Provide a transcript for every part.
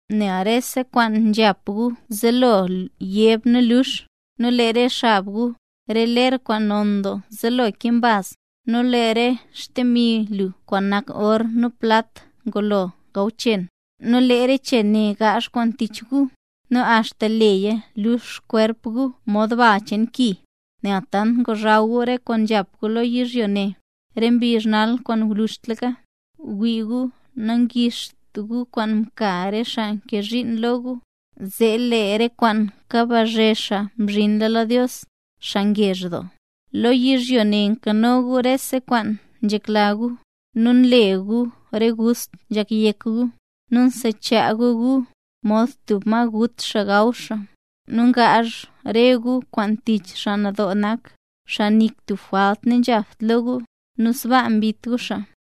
Nel rese kwaan nzhap gu zelo yeb nu lux, nu lee re xab gu, re ler kwaan non doo nzelo kee mbaz. Nu lee re xdemi lu kwaan nak or nu plat ngulo gaw chen. Nu lee re chen ne ngaazh kwaan tich gu, nu axta leeya lux xkwerp gu mod bal cheen ki, nel tant ngozhaw gu re kwaan nzhap gu lo yizhyo ne, re mbizh nal kwaan ngwluzhtlaka. ¡Wii gu, nangixt gu kwaan mka re xaa mkee zhiin lo gu, zee lee re kwaan kabazhe xaa mzhinla lo Dios, xaa ngezh doo! Lo yizhyo ne mkano gu rese kwaan nzhekla gu, nu mle gu re gust nzhak yek gu, nu msechaa gu gu, mod tub ma gut xaa gaw xaa. Nu ngaazh re gu kwaan tich xaa nadoo nak, xaa nik tub jwalt nanzhapt lo gu, nu sbaa mbit gu xaa.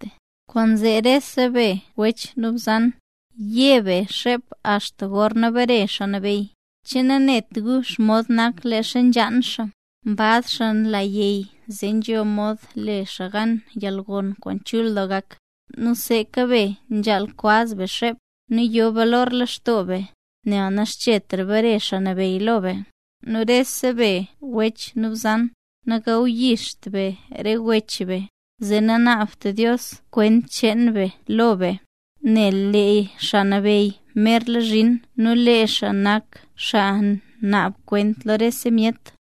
Kwaanzee rese be wech nu bzan, ye be xep axta gorna bare Xaa Nabeyy. ¿Che nanet gu xomod naka leezha nzhaan xaa? Mbaz xaa la yey zee nzho mod le xaa gan koo xaa yalgon kwaan chul doo gak. Nu seeka be, nzhaal kwaz be xep, nu yo balor lextoo be, nel naxchetra bare Xaa Nabeyy lo be. Nu rese be wech nu bzan, nagawyixt be re wech be, zee nanaabt Dios kwent cheen be lo be. Nel lee Xaa Nabeyy merla zhin nu lee xaa nak xaa naab kwent lo rese myet.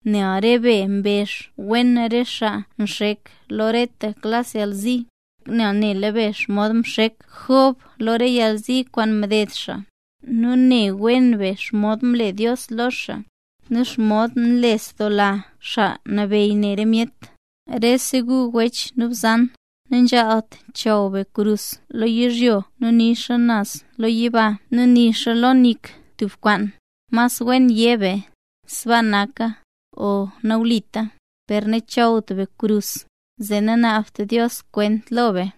Nel re be mbezh wen re xaa nxek lo reta klas yalzi. Nela be xomod mxek Job lo re yalzi kwaan mded xaa; nu ne wen be xomod mle Dios lo xaa, nu xomod nlesdoola Xaa Nabeyy ne re myet. Nu rese gu wech nu bzan, nanzhaalt chaw be krus lo yizhyo nu nixa naz yiba nu nixa lo nik tub kwaan. Mas wen yé be: “Sbaa naka” o “Nawlita”. Per nachawt be krus, zee nanaabt Dios kwent lo be.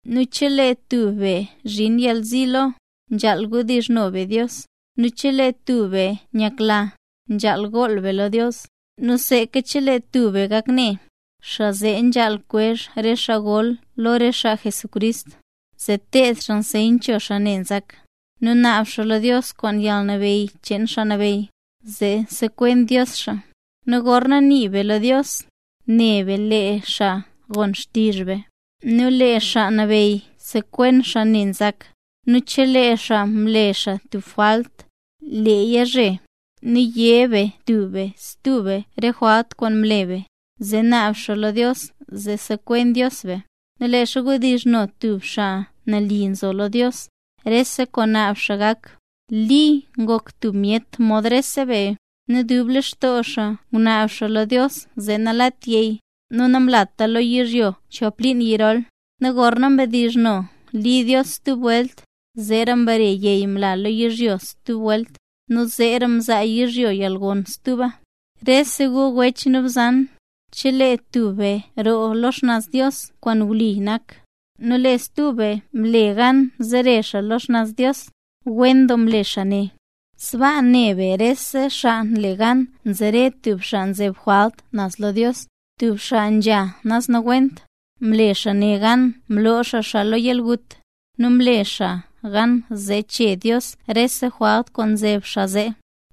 Nu chelee tub be zhin yalzi lo, nzhaal wdizhno be Dios. Nu chelee tub be nyakla, nzhaal gool xaa lo Dios. Nu seeka chelee tub be gak ne, xaa zee nzhaal kwezh re xaa gol lo re xaa Jesucrist, zee teeb xaa anseyt cho xaa ne nzak, nu naab xaa lo Dios kwaan yalnabeyy cheen Xaa Nabeyy, zee sekwen Dios xaa. Nu gorna nii be lo Dios, ne be lee xaa gon xtizh be, nu lee Xaa Nabeyy sekwen xaa ne nzak, nu chelee xaa mle xaa tub jwalt, leeya zhe. Nu yé be tub be stub be re jwalt kwaan mle be, zee naab xaa lo Dios zee sekwen Dios be. Nu leezha nzhedizhno tub xaa nali nzo lo Dios, rese kwaan naab xaa gak. Li ngok tub myet mod rese be, nu dub lextoo xaa ngunaab xaa lo Dios zee nalat yey, nu namlata lo yizhyo chon liin yirol. Nu gorna mbdizhno Li Dios stub welt, zee mbare yey mla lo yizhyo stub welt. Nu zeera mzaa yizhyo yalgon stuba. Rese gu wech nu bzan, chelee tub be mroo lo xnaz Dios kwaan wli nak, nu lee stub be mle gan zere xaa lo xnaz Dios, wen doo mle xaa ne. Sbaa ne be rese xaa nle gan zere tub xaa nzeb jwalt naz lo Dios, tub xaa nzha naz nawent, mle xaa ne gan mloo xaa xaa lo yalgut. Nu mle xaa gan zee chee Dios rese jwalt kwaan mzeb xaa zee.